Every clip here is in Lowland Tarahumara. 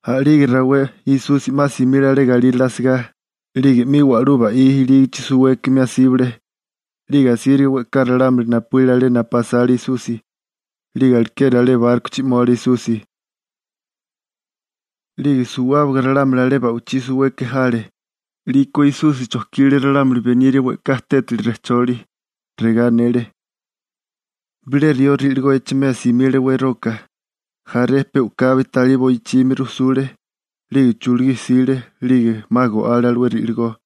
A'lige rawé Esusi 'ma simile alé galírale asigá 'lige 'mi wa'lú ba'í ilígichi suwékimi asíbale. 'Lige asíriga we'ká ralámuli napuíle alé napu asale Esusi. 'Lige alekeri alé bárkochi 'mole Esusi, 'lige suwábaga ralámuli alé ba'wichí suweke jale. 'Liko Esusi chojkile ralámuli beniria we'ká tétali rejcholi. Regá anele: ―Bilé rió ri'ligó echimea simile weroka. Jaré pe u'kabi talí boichimi rujsule. 'Lige chulugí jsile, 'lige 'ma go'ale alué ri'ligó.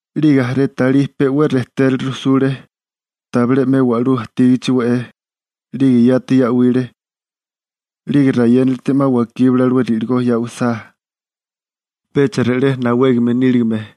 'Lige jaré talí pe 'we rejtérale rujsule, tabilé 'me wa'lú ajtígichi we'é, 'lige yati ya'wile. 'Lige rayénilite 'ma wakíbale alué ri'ligó ya'wisá, pecha re'lé nawégame níligame.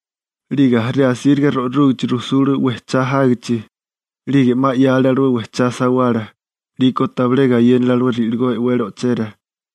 'Lige jaré asíriga ro'rúgachi rujsule wejchá jágichi. 'Lige 'ma 'yale alué wejchá sawala, 'liko tabilé gayénale alué ri'ligó e'wele o'chera.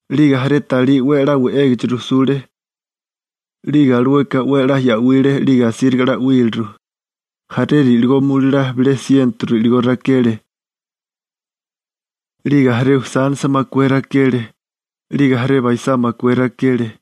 'Lige jaré talí 'we a'lá we'égachi rujsule, 'lige alueka 'we a'lá ya'wile 'lige asíriga 'la 'wíliru. Jaré ri'ligó mulalá bilé siento ri'ligó rakele. 'Lige jaré usánisa makué rakele. 'Lige jaré baisá makué rakele.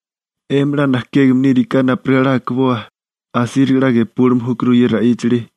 'Emi 'la najkégame níriká napurigá akiboa, asíriga 'la gepúlime júkuru ye ra'íchali.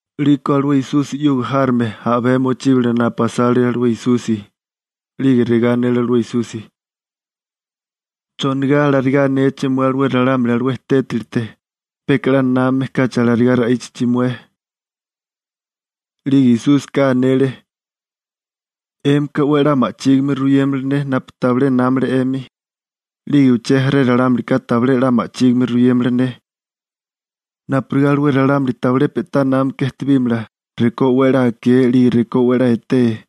'Liko alué Esusi 'yuga járome a'bé mochíbale napu asale alué Esusi, 'lige regá anele alué Esusi: ―¿Chonigá alarigá anéché mué alué ralámuli alué tételite peka 'la námame kachi alarigá ra'íchachi mué? 'Lige Esúsika anele: ―'Émika 'we a'lá ma'chígime ruyémala ne napu tabilé námale 'emi. 'Lige uché jaré ralámulika tabilé 'la ma'chígime ruyémala ne, napurigá alué ralámuli tabilé pe'tá námaka ejtebímala rekó 'we a'lá akee 'lige rekó 'we a'lá etee.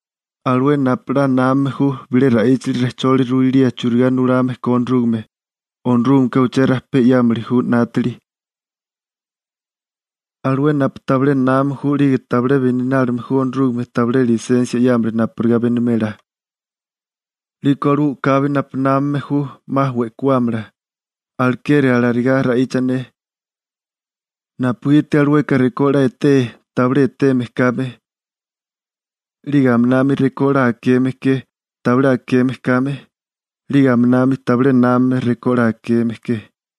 Alué napu 'la námame ju bilé ra'íchali rejcholi ruilía churigá nulame ko Onorúgame, Onorúgameka uché rajpé 'yámili ju 'nátili. Alué napu tabilé námame ju 'lige tabilé beninálime ju Onorúgame tabilé lisensia 'yámala napurigá benimela, 'liko alué u'kabi napu námame ju 'ma we'kuámala. Alekeri alarigá ra'icha ne, napugiti alueka rekó 'la etee, tabilé eteme kame, 'lige aminami rekó 'la akeme ke, tabilé akeme kame, 'lige aminami tabilé námame rekó 'la akeme ke.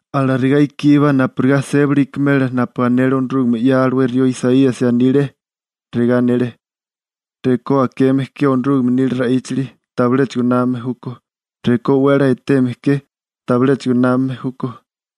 Alarigá ikíbá napurigá sébali ikimela napu anele Onorúgame 'ya alué rió Isaíasi anile. Regá anele: Rekó akeme ke Onorúgame nila ra'íchali, tabiléchigo námame júkó. Rekó 'we a'lá eteme ke, tabiléchigo námame júkó.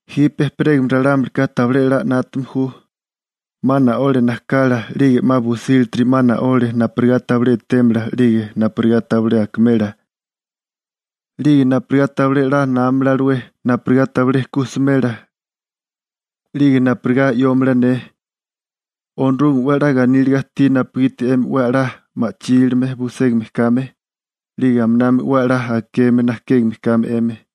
Jipe ejperégame ralámulika tabilé a'lá 'nátame ju, 'ma na'ole najkala 'lige 'ma busílatiri 'ma na'ole napurigá tabilé etémala 'lige napurigá tabilé akimela, 'lige napurigá tabilé 'la námamala alué, napurigá tabilé ku smela, 'lige napurigá 'yómala ne. › Onorúgame 'we ganíliga ajtí napugiti 'emi 'we a'lá ma'chílime buségame kame, 'lige aminami 'we a'lá akeme najkégame kame 'emi.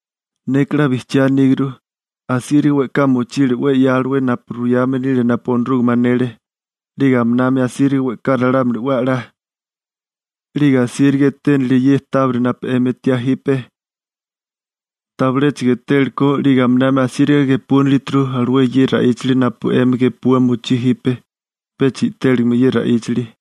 Neka 'la bijchiá aníguru. Asíriga we'ká mochile 'we 'ya alué napu ruyame nile napu Onorúgame anele, 'lige aminami asíriga we'ká ralámuli 'we a'lá, 'lige asíriga eténilie ye tábiri napu 'emi etiá jipe, tabiléchigo etéliko 'lige aminami asíriga gepúnilituru alué ye ra'íchali napu 'emi gepua mochí jipe, pecha i'téligime ye ra'íchali. ›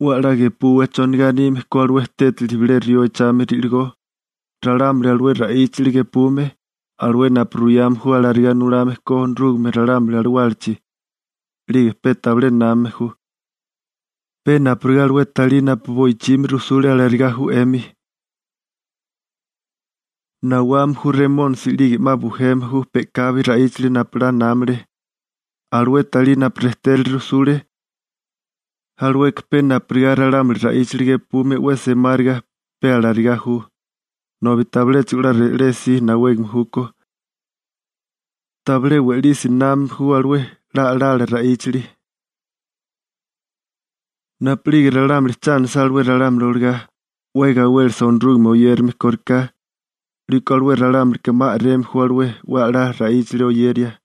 'We a'lá gepuwa chonigá anime ko alué tétali bilé rió echame ri'ligó. Ralámuli alué ra'íchali gepume, alué napu ruyame ju alarigá nulame ko Onorúgame ralámuli alawálachi, 'lige pe tabilé námame ju, pe napurigá alué talí napu boichimi rujsule alarigá ju 'emi. Nawame ju Remónisi 'lige 'ma bujeme ju pe'kabi ra'íchali napu 'la námale. Alué talí napu rejtérale rujsule, alueka pe napurigá ralámuli ra'íchali gepume 'we semáriga, pe alarigá ju, nobi tabiléchigo 'la re'lesi nawégame júkó, tabilé we'lisi oyérame ju Onorúgame. Napu'lige ralámuli cha anisá alué ralámuli olagá, 'we gawélesa Onorúgame oyérame kóriká, 'liko alué ralámulika 'ma a'reme ju alué 'we a'lá ra'íchali oyeria.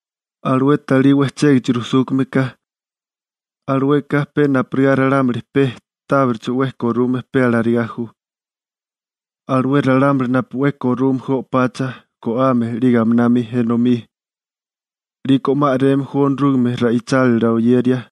Alué talí wejchégichi rujsúkame ka, alueka pe napurigá ralámuli pe tábiricho 'we korume pe alarigá ju, alué ralámuli napu 'we korume ju o'pacha, go'ame 'lige aminami enomí. 'Liko 'ma a'reme ju Onorúgame ra'ichálila oyeria.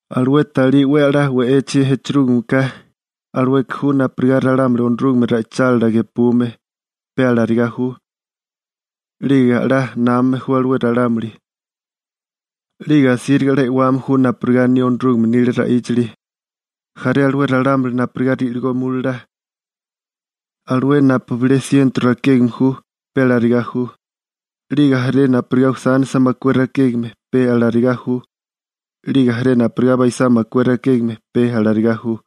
Alué talí 'we a'lá we'echi echerúgime ka, alueka ju napurigá ralámuli Onorúgame ra'ichálila gepume, pe alarigá ju. 'Lige 'we a'lá námame ju alué ralámuli, 'lige asíriga 'la e'wame ju napurigá aní Onorúgame nila ra'íchali. Jaré alué ralámuli napurigá ri'ligó mulalá, alué napu bilé siento rakégame ju, pe alarigá ju. 'Lige jaré napurigá usánisa makué rakégame, pe alarigá ju. 'Lige jaré napurigá baisá makué rakégame, pe alarigá ju.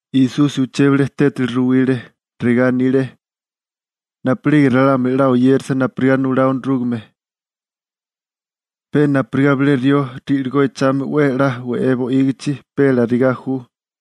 Esusi uché bilé tétali ruwile, regá anile: ―Napu'lige ralámuli 'la oyérasa napurigá nulá Onorúgame, pe napurigá bilé rió ri'ligó echágame 'we a'lá we'é bo'ígichi, pe alarigá ju.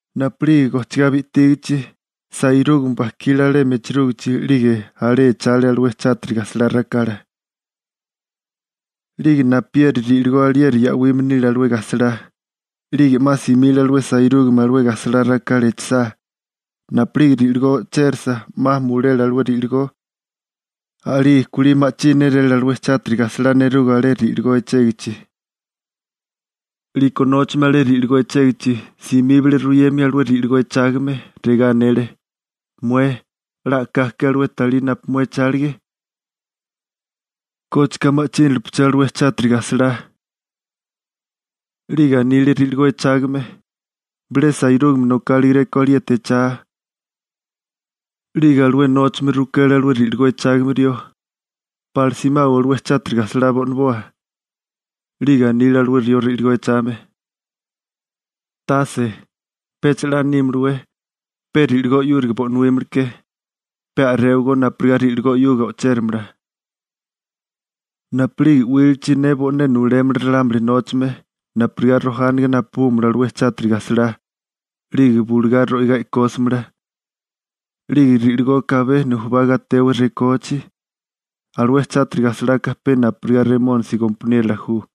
Napu'lige gojchigá bi'tígichi, sairúgame bajkile alemi echerúgichi 'lige alé echale alué chátiri gajsalá rakala. 'Lige napieri ri'ligó alieri ya'wime nile alué gajsalá. 'Lige 'ma simile alué sairúgame alué gajsalá rakala echisá. Napu'lige ri'ligó o'chérasa, 'ma mulele alué ri'ligó, a'lige kulí ma'chí néréle alué chátiri gajsalá nerugo alé ri'ligó echégichi. 'Liko nóchame alé ri'ligó echégichi, simíbale ruyemia alué ri'ligó echágame. Regá anele: «Mué, ¿'la a'ká ke alué talí napu mué echálige? ¿Kócheka ma'chínalepeché alué chátiri gajsalá?» 'Lige anile ri'ligó echágame: «Bilé sairúgame nokálegeréko alieti echá.» 'Lige alué nóchame rukele alué ri'ligó echágame rió: «¿Pala simawa alué chátiri gajsalá bo'naboa?» 'Lige anile alué rió ri'ligó echame: «Tase, pecha 'la nímalawé, pe ri'ligó 'yúriga bo'nuímaleké. Pe a'réwagó napurigá ri'ligó 'yuga o'chéramala. Napu'lige 'wílichi ne bo'né nulémala ralámuli nóchame napurigá rojániga napabúmala alué chátiri gajsalá, 'lige bulugá ro'igá e'kósamala. 'Lige ri'ligoka abé nujubá gatewa rekóachi.» (Alué chátiri gajsalaka pe napurigá Remónisi gompaniérola ju.)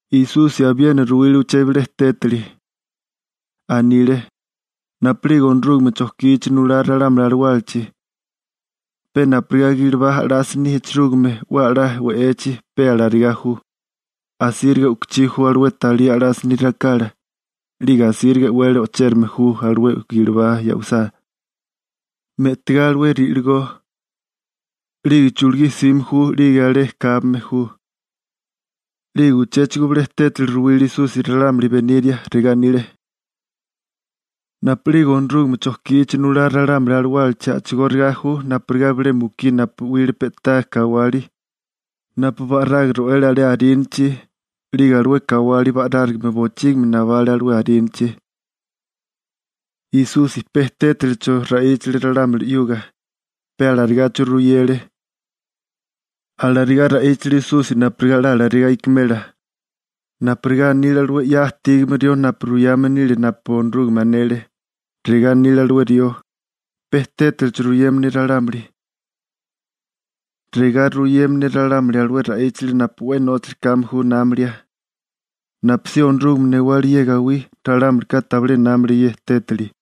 Esusi abiena ruwile uché bilé tétali. Anile: ―Napu'lige Onorúgame chojkichi nulá ralámuli alawálachi, pe napurigá gilibá a'lásini echerúgime 'we a'lá we'echi, pe alarigá ju. Asíriga u'kichí ju alué talí a'lásini rakala, 'lige asíriga e'wele ochérame ju alué gilibá ya'wisá, me'tigá alué ri'ligó. 'Lige chulugí jsime ju 'lige alé kábame ju. 'Lige uchéchigo bilé tétali ruwile Esusi ralámuli beniria. Regá anile: ―Napu'lige Onorúgame chojkichi nulá ralámuli alawálachi a'chigóriga ju napurigá bilé mukí napu 'wile pe'tá kawali, napu ba'raga ro'ele alé arínachi 'lige alué kawali ba'rárigame bochígimi nabale alué arínachi. Esusi pe tétalicho ra'íchale ralámuli 'yuga, pe alarigacho ruyele. Alarigá ra'íchale Esusi napurigá 'la alarigá ikimela napurigá anile alué 'ya ajtígame rió napu ruyame nile napu Onorúgame anele. Regá anile alué rió: Pe tétalicho ruyema ne ralámuli. Regá ruyema ne ralámuli alué ra'íchali napu 'we nóchali kame ju námalia. Napusí Onorúgame newálige ye gawí, ralámulika tabilé námale ye tétali.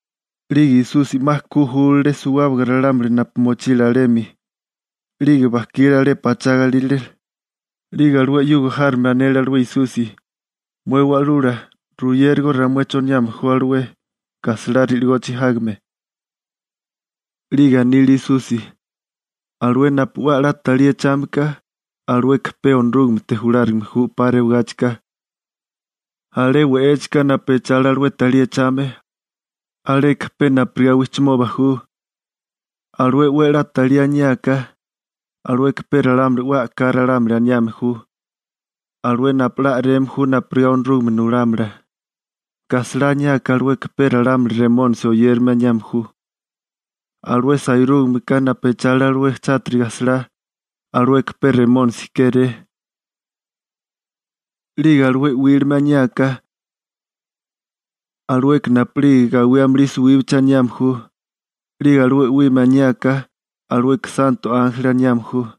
'Lige Esusi 'ma ku júlale suwábaga ralámuli napu mochile alemi, 'lige bajkile alé pachá galírale 'lige alué 'yuga járome anele alué Esusi: ―Mué Wa'lula, ruyérigó ramué choniame ju alué gajsalá ri'ligochi jágame. 'Lige anile Esusi: ―Alué napu 'we a'lá talí echame ka, alueka pe Onorúgamete julárigame ju 'pa rewagáchika. Alé we'échika napu echale alué talí echame, aleka pe napurigá wijchimoba ju. Alué 'we a'lá talí aniáká, alueka pe ralámuli 'we a'ká ralámuli aniame ju, alué napu 'la a'reme ju napurigá Onorúgame nulámala. Gajsalá aniáká alueka pe ralámuli Remónisi oyérame aniame ju. Alué sairúgameka napu echale alué chátiri gajsalá, alueka pe Remónisi kéré. 'Lige alué 'wílime aniáká, alueka napu'lige gawí amulí suwíbachi aniame ju. 'Lige alué 'wime aniáká, alueka santo ánjeli aniame ju.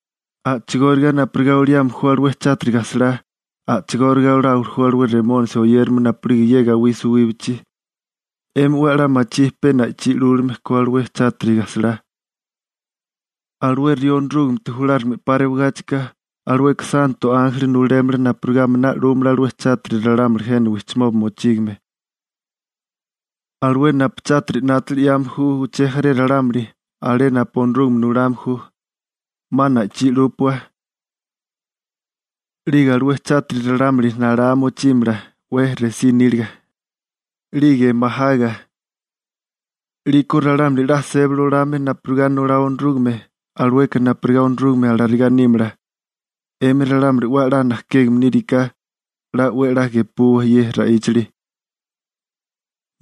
A'chigóriga napurigá oliame ju alué chátiri gajsalá, a'chigóriga oláwili ju alué Remónisi oyérame napu'lige ye gawí suwíbachi. 'Emi 'we a'lá machí pe na'ichí 'lúlime ko alué chátiri gajsalá. Alué rió Onorúgamete julárigame 'pa rewigáchika, alueka santo ánjeli nulémala napurigá a'miná 'lúmala alué chátiri ralámuli jena wijchimoba mochígame, alué napu chátiri 'nátili 'yame ju uché jaré ralámuli, alé napu Onorúgame nulame ju. 'Ma na'ichí 'lúpua. 'Lige alué chátiri ralámuli nalá mochímala 'we resí níliga, 'lige majaga. 'Liko ralámuli 'la sébali olame napurigá nulá Onorúgame, alueka napurigá Onorúgame alarigá nímala. 'Émi ralámuli 'we a'lá najkégame níriká, 'la 'we a'lá gepuwa ye ra'íchali. ›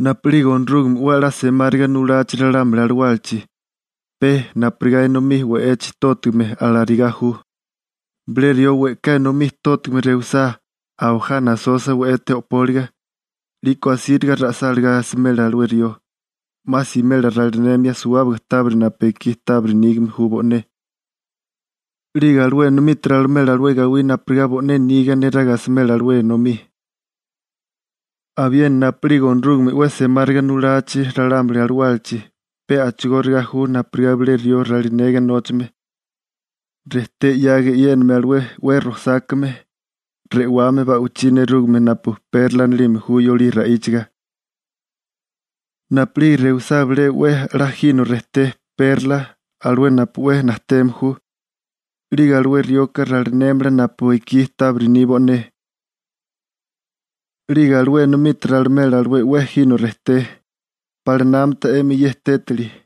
Napu'lige Onorúgame 'we a'lá semáriga nulachi ralámuli alawálachi, pe napurigá enomí we'echi tótigame, alarigá ju. Bilé rió we'ká enomí tótigame rewisá, abajá nasosa we'ete o'póliga. 'Liko asíriga ra'sáligá asimela alué rió, 'ma simela ralinemia suwábaga tábiri napu ekí tábiri nígame ju bo'né. 'Lige alué enomite ralimela alué gawí napurigá bo'né niga neraga asimela alué enomí. › Abiena napu'lige Onorúgame 'we semáriga nulachi ralámuli alawálachi, pe a'chigóriga ju napurigá bilé rió ralinega nóchame, rejté 'yaga eyéname alué 'we rojsákame re'wame ba'wichí nerúgame napu «perla» anilime ju yolí ra'íchaga. Napu'lige rewisá bilé 'we a'lá jino rejté «perla» alué napu 'we najteme ju, 'lige alué rioka ralinémala napu ekí tábiri ni bo'né, 'lige alué enomite ralimela alué 'we jino rejté. ¿Pala 'la námata 'emi ye tétali?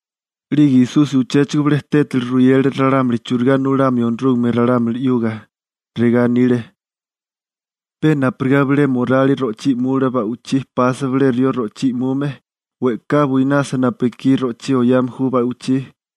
'Lige Esusi uchéchigo bilé tétali ruyele ralámuli churigá nulamio Onorúgame ralámuli 'yuga. Regá anile: ―Pe napurigá bilé morali ro'chí i'mula ba'wichí pasa bilé rió ro'chí i'mume, we'ká buinasa napu ekí ro'chí oyame ju ba'wichí.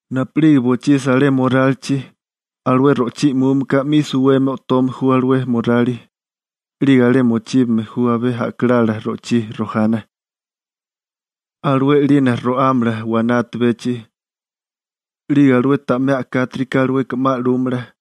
Napu'lige bochisa alé morálichi, alué ro'chí i'múmeka 'mi suwemi o'tome ju alué morali, 'lige alé mochíbame ju abé a'kalala ro'chí rojana, alué 'lina ro'ámala waná atabechi. 'Lige alué ta'mé a'kátirika alueka 'ma 'lúmala.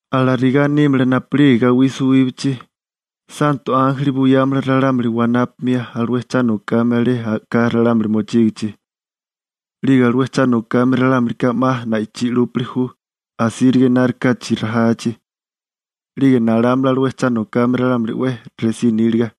Alarigá nímala napu'lige gawí suwíbachi. Santo ánjeli buyámala ralámuli wanápamia alué cha nokame alé a'ká ralámuli mochígichi. 'Lige alué cha nokame ralámulika 'ma na'ichí 'lúpili ju, asíriga enárikáchi rajachi. 'Lige nalámala alué cha nokame ralámuli 'we resí níliga.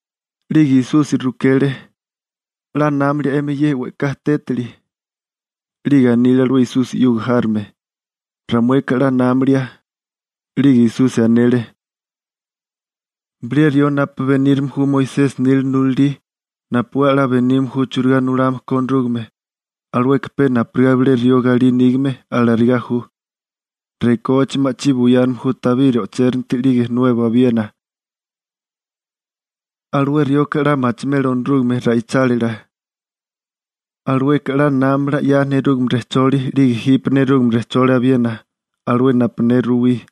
'Lige Esusi rukele: ―¿'La námilia 'emi ye we'ká tétali? 'Lige anile alué Esusi 'yuga járome: ―Ramueka 'la námilia. 'Lige Esusi anele: ―Bilé rió napu benírame ju Moisesi nila nulalí napu 'we a'lá benime ju churigá nulame ko Onorúgame, alueka pe napurigá bilé rió galí nígame, alarigá ju. Rekóachi ma'chí buyáname ju tabiri o'chéranti 'lige nuebo abiena. Alué rioka 'la machimela Onorúgame ra'ichálila, alueka 'la námamala 'ya nerúgame rejcholi 'lige jipe nerúgame rejcholi abiena, alué napu ne ruwí.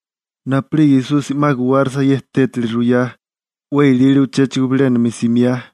Napu'lige Esusi 'ma guwárisa ye tétali ruyá, 'we ilile uchéchigo bilénami simiá.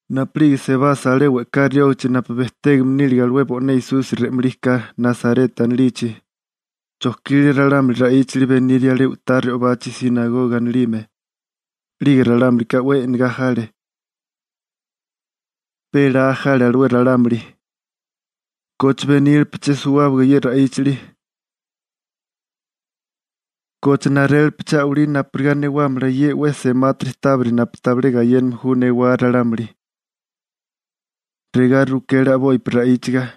Napu'lige sebasa alé we'ká riógichi napu bejtégame nílige alué bo'né Esusi re'malí ka (Nasareta anilichi), chojkile ralámuli ra'íchali beniria alé u'tá re'obachi «sinagoga» anilime. 'Lige ralámulika 'we e'negá jale. Pe laa jale alué ralámuli: ―¿Koche benílepeché suwábaga ye ra'íchali? ¿Koche narélepeché a'walí napurigá newámala ye 'we semátiri tábiri napu tabilé gayéname ju newá ralámuli? ―regá rukele a'bopi ra'íchaga—.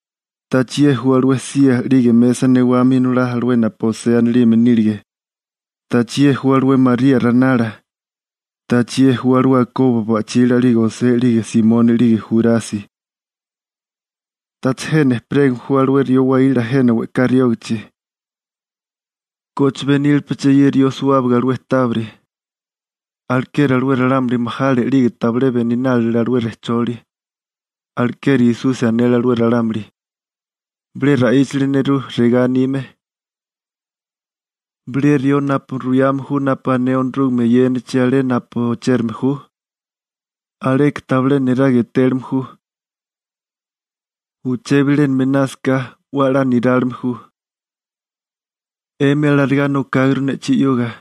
¿Tacha ye ju alué sía 'lige mesa newame inolá alué napu José anilime nílige? ¿Tacha ye ju alué María ranala? ¿Tacha ye ju alué Jacobo ba'chila 'lige José 'lige Simoni 'lige Jurasi? ¿Tacha jena ejperégame ju alué rió waíla jena we'ká riógachi? ¿Koche benílepeché ye rió suwábaga alué tábiri? Alekeri alué ralámuli majale 'lige tabilé beninálile alué rejcholi. Alekeri Esusi anele alué ralámuli: ―Bilé ra'íchali nerú regá anime: «Bilé rió napu ruyame ju napu ané Onorúgame eyénachi alé napu ochérame ju, aleka tabilé niraga etélime ju. Uché bilénami einásaká, 'we a'lá nirálime ju. 'Emi alarigá nokáguru ne'chí 'yuga.»